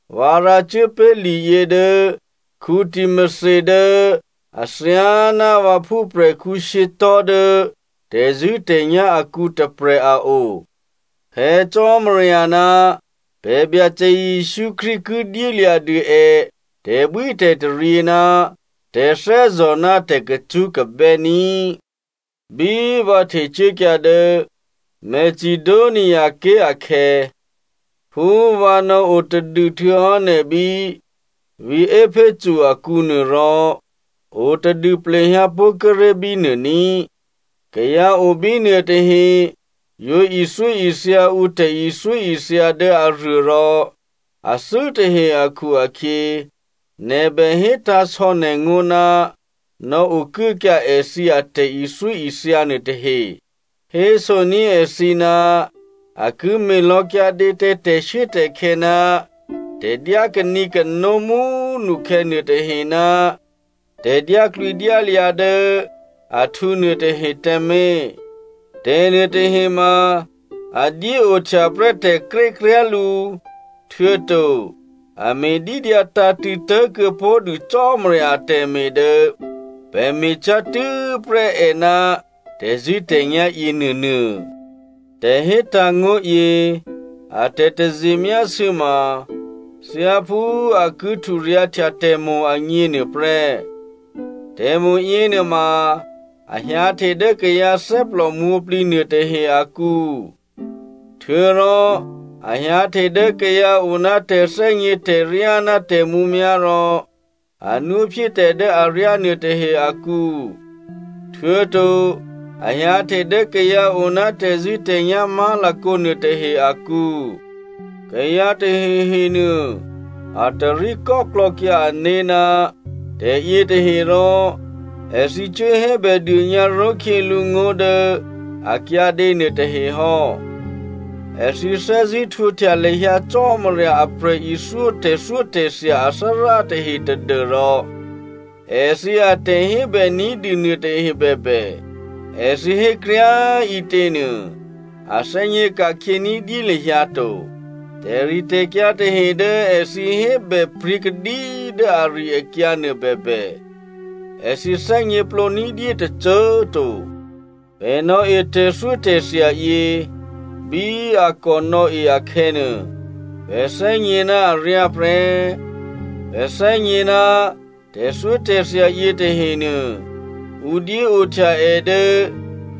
Vǎ rǎcuố pé̤ liyě dố Timothy dố athyáná vǎ phúprè̤khǔ shyětò̤́ dố tè̤zṳ̂́tè̤nyá̤ akǔ tôprè̤ a o. Phè̌ Cò́marya ná pè̤ Byacè Jesǔ Krístu ki dyélya̤dû è tè̤bwítè̤taryě ná tè̤thè́zò̤ ná tè̤kacṳ́kabè́ ní꤮. Bí vǎ htecuốkyǎ dố Macedoniaké̤ akhè̌, phú vǎ nò̌o tadû htuô̌hò́ nè̤ bí vǐ̤ Epheso akǔnuô, rò o tadû plehyǎpó̤ kíré̤ bínuô ní꤮. Kayǎ o bí nuôtahe yǒ ithyóithya ǔ tè̤ithyóithya dố aruô rò athû́ tahe akhu-akhyě, nè̤ bè hétǎ̤sò̌ nè̤ngó̤ ná nò̌okuốkyǎ èthǐ atè̤ithyóithya nuôtahe. Hésoní̤ èthǐ ná a ki me̤lò̌ kyǎdě tǎ tè̤shuốtè̤khè̌ ná tè̤dyá kanǐkano mú꤮ nukhè̌ nuôtahe ná tè̤dyáklwǐdyályǎ dố ahtǔ nuôtahe tǎmé̤. Tè̤nuôtahe ma a dyéohtya prè́ tè̤krékryá̤ lǔ, htuô̌to a me̤dídyǎ tǎ̤tṳ̂̌ tố̤kuô̌pó̤dû Cò́marya atè̤me̤ dố pè̤ me̤cyá̤ tû́prè́ è ná tè̤zṳ̂́tè̤nyá̤ yěnuônuô. Tè̤hétǎ̤ ngó̤yě a tè̤taze myásû̌ ma thyáphú a ki hturyǎ̤htya tè̤mo̤ agně nuôprè́. Tè̤mo̤ yěnuôma a hyǎhte dố kayǎ thè́plò mwǒ̤plǐ nuôtahe akǔ. Htuô̌rò a hyǎhte dố kayǎ o ná tè̤thè́gně tè̤ryá ná tè̤mǔmyá̤ rò a nwóphyé tè̤ dố aryá nuôtahe akǔ, htuô̌to a hyǎhte dố kayǎ o ná tè̤zṳ̂́tè̤nyá̤ má̤lakǒ nuôtahe akǔ. Kayǎ tahehe nuô, a tarí kò́klò̌kyǎ ané̤ ná tè̤yětahe rò èthǐ cuốhébèdônyǎ ró̤khyělǔ ngó̤ dố a kyǎdě nuôtahe hò́. Èthǐ thè́zṳ̂́ htwǒhtya lahyǎ Cò́marya a prè̤ithyó tè̤thyótè̤thya athárá tahe tadû́rò èthǐ atè̤hébè ní̤dû nuôtahe bèbè, èthǐ hékryá꤮ ǐtěnuô a thè́gně ka̤khyě ní̤dyé lahyǎ to. Tè̤ritè̤kyǎ tahe dố èthǐ hébè pryě̤kadí dố ari-akyǎnuô bèbè, èthǐ thè́gněplǒ ní̤dyé tôcô꤮ to. Pè̤ nò̌e tè̤thyótè̤thya yě bí a kò nò̌e akhè̌nuô, pè̤ thè́gně ná aryá prè́. Pè̤ thè́gně ná tè̤thyótè̤thya yětahenuô, ǔ dyéohtya è dố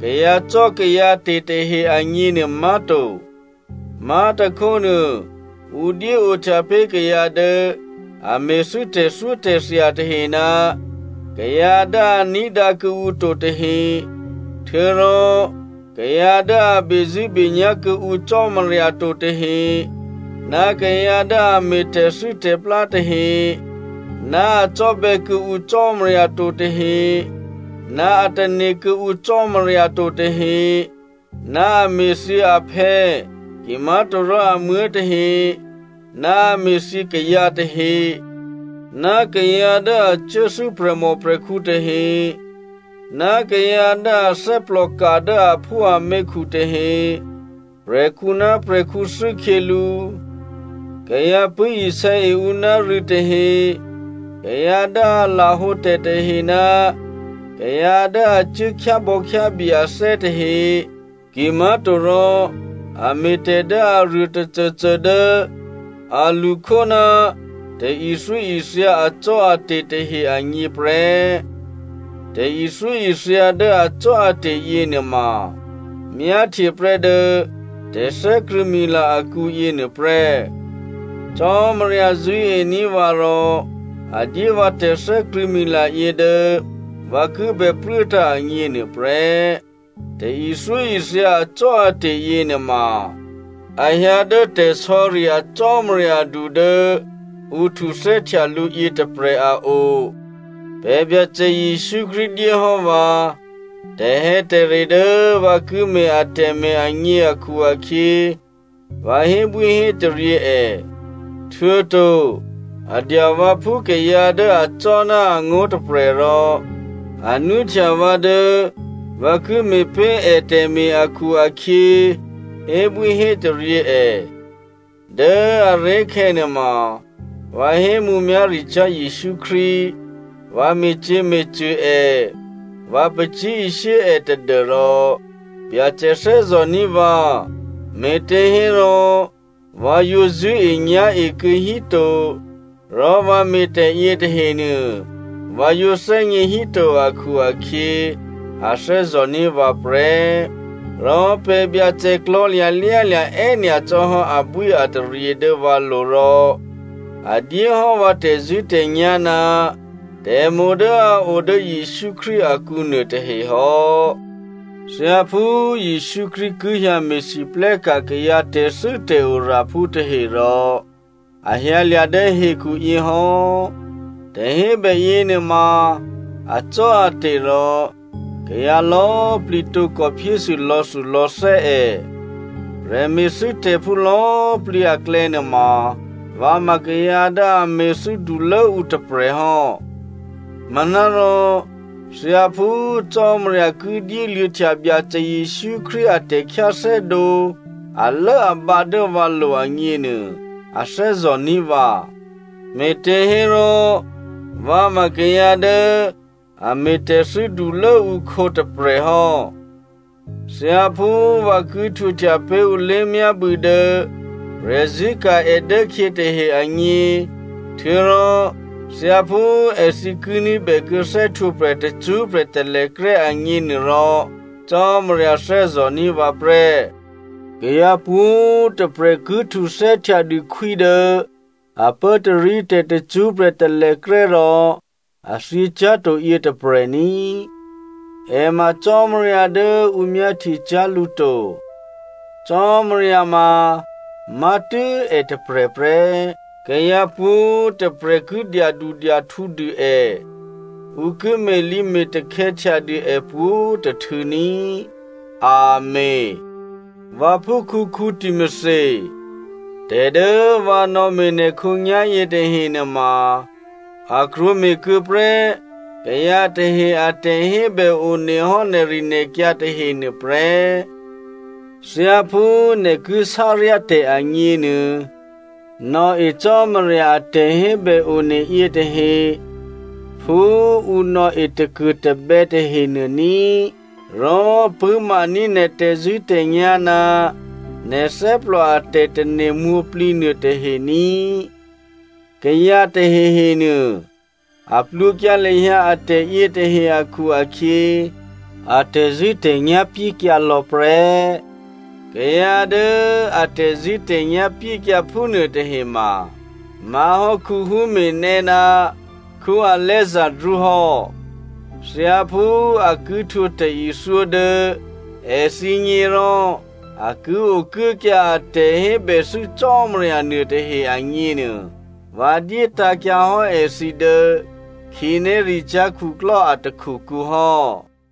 kayǎcò́kayǎte̤ tahe agněnuô má̤to. Má̤tôkhónuô, ǔ dyéohtya pé̤ kayǎ dố a me̤thû́ tè̤thyótè̤thya tahe ná kayǎ dố a ní̤dǎ kuô̌ǔ to tahe, htuô̌rò kayǎ dố a bezṳ̂́benyá̤ kuô̌ǔ Cò́marya to tahe, ná kayǎ dố a me̤ tè̤thû́tè̤plá tahe, ná a cò́bè̌ kuô̌ǔ Cò́marya to tahe, ná a tane̤ kuô̌ǔ Cò́marya to tahe, ná a me̤thyě aphè̌ kimá̤torò amuố̤ tahe, ná a me̤thyě kayǎ tahe, kayǎ dố a cuốthû́ prè̤mòprè̤khǔ tahe, kayǎ dố a thè́plòka dố aphúaměkhu tahe, prè̤khǔ ná prè̤khǔ thû́khyělǔ, kayǎ pṳ̂́isè̌e ǔ ná rû̌ tahe, kayǎ dố a lahǒtè̤ tahe ná kayǎ dố a cuố khyábò̌khyábye athè́ tahe, kimá̤torò a me̤tè̤ dố aruô tôcôcô dố a lṳkhó ná tè̤ithyóithya acò́ate̤ tahe agně prè́. Tè̤ithyóithya dố acò́ate̤ yěnuôma, myáhtye prè́ dố tè̤thè́krṳ̂̌mila akǔ yěnuô prè́. Cò́marya zṳ̂́ení̤ vǎ rò a dyé vǎ tè̤thè́krṳ̂̌mila yě dố vǎ ki bè pruốtǎ̤ agně nuôprè́. Tè̤ithyóithya acò́ate̤ yěnuôma a hyǎ dố tè̤sò̌ri a Cò́marya du dố ǔ htuthè́htya lǔ yětôprè̤ a o. Pè̤ Byacè Jesǔ Krístu dyé hò́ vǎ tè̤hè̌tè̤re dố vǎ ki me̤ atè̤me̤ agně akhu-akhyě, vǎ hébwíhétaryě è. Htuô̌to a dya vǎ phú kayǎ dố acò́ ná angó̤ tôprè̤ rò a nwóhtya vǎ dố vǎ ki me̤pé̤ ètè̤me̤ akhu-akhyě, hébwíhétaryě è. Dố꤮ aré̤khè̌ nuôma, vǎ hé mǔmyá̤ricyá̤ Jesǔ Krístu, vǎ me̤cyě̤me̤cṳ̂ è, vǎ pacyé̤ishyé è tadû́rò Byacè thè́zò̤ní̤ vǎ, me̤těhérò vǎ yǒ zṳ̂́enyá̤e kuô̌hí to, rò vǎ me̤tè̤ yětahenuô, vǎ yǒ thè́gně híto akhu-akhyě, a thè́zò̤ní̤ vǎ prè́. Rò pè̤ Byacè klò̤̌lya̤ lyálya̤ è́nyacò́ hò́ abwíataryě dố vǎlo̤ rò a dyéhò́ vǎ tè̤zṳ̂́tè̤nyá̤ ná tè̤mo̤ dố a o dố Jesǔ Krístu akǔ nuôtahe hò́. Thyáphú Jesǔ Krístu ki hyǎ me̤lwóhteka̤ kayǎ tè̤thû́tè̤oraphú tahe rò, a hyǎlya̤ dố hekhu yě hò́. Tè̤hébè yěnuôma acò́ate̤ rò kayǎ lò̌꤮ plǐ tǒkò phyésû lò̌thulò̌thè́ è. Prè̤me̤thû́tè̤phú lò̌꤮ plǐ aklè̌nuôma vǎ ma kayǎ dố a me̤thû́ dulốǔ tôprè̤ hò́. Manárò thyáphú Cò́marya ki dyéluô̌htya Byacè Jesǔ Krístu a tè̤khyáthè́dǒ alốabǎ dố vǎlo̤ agněnuô, a thè́zò̤ní̤ vǎ. Me̤těhérò vǎ ma kayǎ dố a me̤tè̤thû́ dulốǔkhǒ tôprè̤ hò́. Thyáphú vǎ ki htwǒhtya pé̤ ǔ lé̤myábû̌ dố prè̤zṳ̂́e è dốkhyě tahe agně, htuô̌rò thyáphú èthǐ ki ní̤bèkuô̌ thè́htwǒprè̤ tacṳ́prè̤ talèkrè́ agně nuôrò Cò́marya thè́zò̤ní̤ vǎ prè́. Kayǎ pwǒ̤꤮ tôprè̤ ki htuthè́htya dû khwí dố a pốtarítè̤ tacṳ́prè̤ talèkrè́ rò a thyěcyá̤to yětôprè̤ ní꤮. È ma Cò́marya dố ǔ myáhtyecyá̤ lǔ to. Cò́marya mamá̤tû́ è tôprè̤ prè́. Kayǎ pwǒ̤꤮ tôprè̤ ki dyadudyahtǔdû è, ǔ ki me̤lǐme̤takhè̌ htyadû è pwǒ̤tôhtû̌ ní꤮. Amèn. Vǎphúkhǔ Timothy, tè̤dố vǎ nò̌me̤ nè̤ khǒnyá̤ yětahe nuôma, a krwǒme̤ kuô̌prè́ kayǎ tahe a tè̤hébè one hò́ nè̤rinè̤kyǎ tahe nuôprè́. Thyáphú nè̤ ki sáryá tè̤ agněnuô, nò̌e Cò́marya a tè̤hébè one yětahe phú ǔ nò̌e takuô̤tabè̌ tahenuô ní꤮. Rò pṳ̂́maní̤ nè̤ tè̤zṳ̂́tè̤nyá̤ ná nè̤ thè́plò a tè̤tane̤ mwǒ̤plǐ nuôtahe ní꤮. Kayǎ tahehenuô, a plwǒkyǎ lahyǎ atè̤ yětahe akhu-akhyě a tè̤zṳ̂́tè̤nyá̤ pyékyǎ lò̌ prè́. Kayǎ dố a tè̤zṳ̂́tè̤nyá̤ pyékyǎ phúnuôtahe ma má̤hò́ Hymenaeo ná Alexandro hò́. Thyáphú a ki htwǒ tè̤ithyó dố èthǐgně rò a ki okuốkyǎ a tè̤hébèthû́ Cò́marya nuôtahe agněnuô, vǎ dyétǎ̤kyǎ hò́ èthǐ dố khǐnéricyá̤ khuklò́ a takhukǔ hò́.